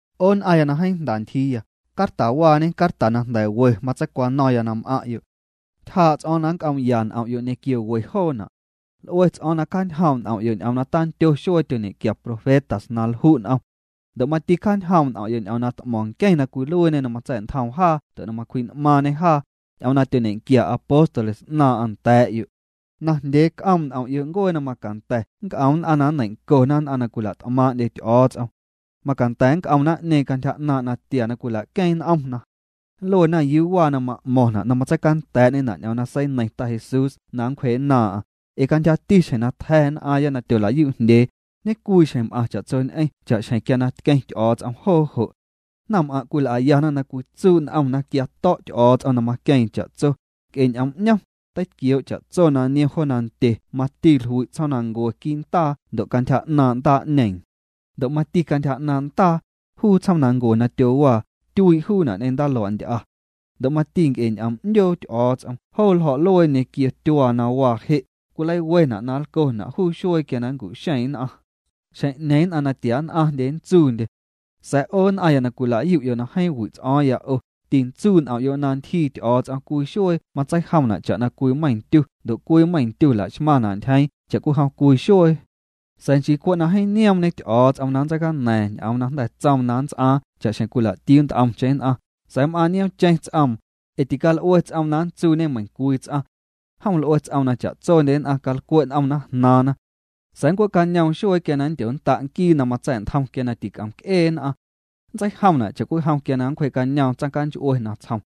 'O nn'aⁿya na jeeⁿ jnda ntyjiiya, cartawaañe carta jnda̱ we matseicwano̱ⁿya na m'aⁿ'yo'. Ntyjaa' ts'o̱o̱ⁿ na nnc'oom'ya n'om'yo' ñequio we joona'. L'ue ts'o̱o̱ⁿ na cjañjoom' n'om'yo' ñ'oom na tandyo xuee tyoñequia profetas na lju' n'om. Ndo' mati cjaañjoom' n'om'yo' ñ'oom na t'mo̱ⁿ nqueⁿ na cwiluiiñê na matsa̱'ntjoom jaa ndo' macwji'n'maaⁿñê jaa, ñ'oom na tyoñequia apóstoles 'naaⁿ'aⁿ nda̱a̱'yo'. Najndyee c'oom' n'om'yo' ncuee na macanda̱ nnc'om nn'aⁿ na nneiⁿ'ncona nn'aⁿ na cwila't'maaⁿ'ndye Ty'o̱o̱ts'om. Macanda̱ nnc'om naⁿ'ñeeⁿ cantyja 'naaⁿ' natia na cwila'queeⁿ n'omna. Nluena: “¿Yuu waa na ma'mo̱ⁿna' na matseicanda̱a̱'ñena' ñ'oom na seineiⁿ Ta Jesús na nncwjee'nnaaⁿ'aⁿ? Ee cantyjati xjeⁿ na tja̱ nn'aaⁿya na tyolayu'jndyee, ñecwiixjeⁿ m'aⁿ cha'tsoñ'eⁿ cha'xjeⁿ quia na tqueⁿ Ty'o̱o̱ts'om joo jo'.” Naⁿm'aⁿ' cwil'ayana na cwitsuu' n'omna quia to̱' Ty'o̱o̱ts'om na maqueeⁿ cha'tso, nc'e ñ'oom 'ñom, teitquioo' cha'tso na niom jo nandye mati jlui' tsjoomnancue quii' ndaa ndo' cantyja 'naaⁿ' ndaa'ñeeⁿ. Ndo' mati cantyja 'naaⁿ' ndaa, juu tsjoomnancue na tyowaa, tyuii' juuna' ñ'eⁿ ndaalua'nty'a. Ndo' mati nc'e ñ'oom 'ndyoo Ty'o̱o̱ts'om, joo ljo̱'luee ñequio tyuaa na waa je', cwileiwena' na lcona' juu xuee quia na nncu'xeeⁿ nn'aⁿ. Xjeⁿ'ñeeⁿ nn'aⁿ natia nn'aⁿndye nntsuundye. Sa̱a̱ 'o nn'aⁿya na cwila'yu'yo' na jeeⁿ wi' ts'o̱o̱ⁿya 'o, tintsuu' n'om'yo' na ntyjii Ty'o̱o̱ts'om cwii xuee matseijomna' cha'na cwii meiⁿ ndyu ndo' cwii meiⁿ ndyu laxmaⁿna' ntyjeeⁿ cha'cwijom cwii xuee. Sa̱a̱ nchii cwe' na jeeⁿ nioomñe Ty'o̱o̱ts'om na nntseicaña̱a̱ⁿ ñ'oom na jnda̱ tsoom na nnts'aaⁿ cha'xjeⁿ cwila'tiuu nt'omcheⁿ nn'aⁿ, sa̱a̱ m'aaⁿ nioomcheⁿ ts'oom, ee tical'ue ts'oom na nntsuuñe meiⁿcwii ts'aⁿ. Jom l'ue ts'oom na cha'tsondye nn'aⁿ calcwe' n'omna jnaaⁿna. Sa̱a̱ nncue'cañoom xuee quia na nndyonnda' Nquii na matsa̱'ntjom quia na tic'omc'ee nn'aⁿ. Nntseijomna' cha'cwijom quia na nncwjee'cañoom tsaⁿnch'ue natsjom.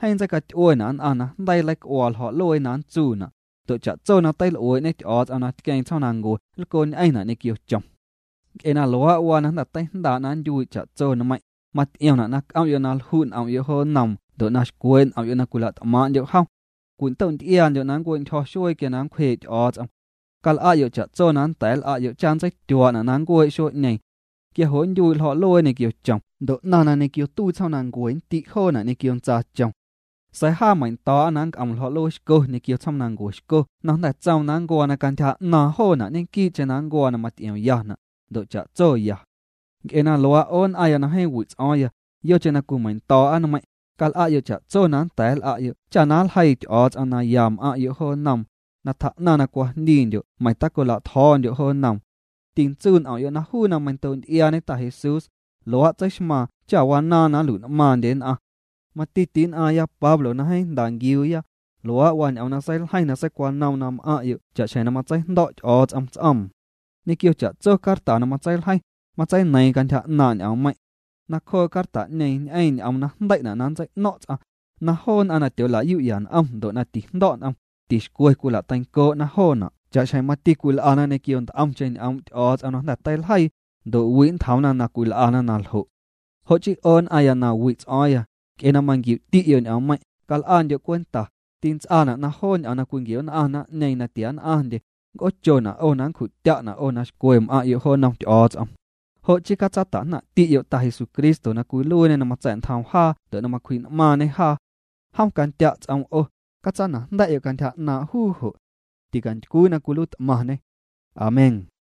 Jeeⁿ nntseicaty'uena' nn'aⁿ na jndeii nleic'uaa ljo̱'luee na nntsuuna', ndo' cha'tso na teil'uee'ñe Ty'o̱o̱ts'om na tqueeⁿ tsjoomnancue nlcoñ'eⁿna' ñequio chom. Nc'e na luaa' waa na jnda̱ teijndaa' na nntyuii' cha'tso nmeiⁿ', maty'iomna' na c'om'yo' na lju' n'om'yo' jo nnoom ndo' na xcwee' n'om'yo' na cwila't'maaⁿ'ndyo' jom. Cwindo'nty'iaandyo' na nncue'ntyjo̱ xuee quia na nncwjee' Ty'o̱o̱ts'om. Cal'a'yo' cha'tso na nnda̱a̱ nl'a'yo' cha nntseityuaa'na' na nncuee' xuee'ñeeⁿ. Quia jo' nntyuii' ljo̱'luee ñequio chom ndo' 'naⁿ na ñequio tuii tsjoomnancue nndi' joona' ñequio ntsaachom. Sa̱a̱ jaa meiⁿndo̱o̱'a na nnc'om ljo̱'luee xco ñequio tsjoomnancue xco na jnda̱ tsoom na nncuaa na cantyja 'naaⁿ joona' ñequii'cheⁿ nncuaa na maty'iomyana', ndo' cha'tso ya. Nc'e na luaa', 'o nn'aⁿya na jeeⁿ wi' ts'o̱o̱ⁿya, yocheⁿ na cwimeiⁿndo̱o̱'a nmeiⁿ', cal'a'yo' cha'tso na nnda̱a̱ nl'a'yo' cha na nljeii Ty'o̱o̱ts'om na ya m'aⁿ'yo' jo nnoom, na tjaa'naⁿ na cwajndiindyo' meiⁿ tacolatjo̱o̱ndyo' jo nnoom. Tintsuu' n'om'yo' na juu na meiⁿndoo'nty'iaañe Ta Jesús, luaa' tseixmaaⁿ cha wanaaⁿ na nlui'n'maaⁿndye nn'aⁿ. Mati ti'nn'aaⁿya Pablo na jeeⁿ jnda nquiuuya, luaa' waa ñ'oom na seiljeiⁿ na seicwanoom nda̱a̱'yo' cha'xjeⁿ na matseijndo̱' Ty'o̱o̱ts'om ts'oom. Ñequio cha'tso carta na matseiljeiⁿ, matseineiiⁿ cantyja 'naaⁿ' ñ'oommeiⁿ'. Nacjoo' carta'ñeeⁿ ñ'eeⁿ ñ'oom na jndei'na' na nntsei'no̱ⁿ' ts'aⁿ, na joo nn'aⁿ na tyoola'yu'ya n'om ndo' na tijndo̱' n'om, tixcwe cwila'teincoo'na joona' cha'xjeⁿ mati cwil'ana ñequio nt'omcheⁿ ñ'oom' Ty'o̱o̱ts'om na jnda̱ teiljeii, ndo' wi' ntjoomna na cwil'ana na ljo'. Jo' chii 'o nn'aⁿya na wi' ts'o̱o̱ⁿya, nc'e na manquiu'ti'yo' ñ'oommeiⁿ', cal'andyo' cwenta, tints'aana' na joo ñ'oom na cwinquio'nn'aⁿ naⁿ'ñeeⁿ na tia nn'aⁿndye, nnc'oochona' 'o na nncju'tya'na' 'o na xcwe m'aⁿ'yo' jo nnom Ty'o̱o̱ts'om. Jo' chii catsata'jnaⁿ'ti'yo' Ta Jesucristo na cwiluiiñê na matsa̱'ntjoom jaa ndo' na macwji'n'maaⁿñê jaa. Jom candya' ts'oom 'o, catsana'jnda̱'yo' cantyja 'naaⁿ' juu jo'. Ticantycwii na cwiluiit'maⁿñê. Amén.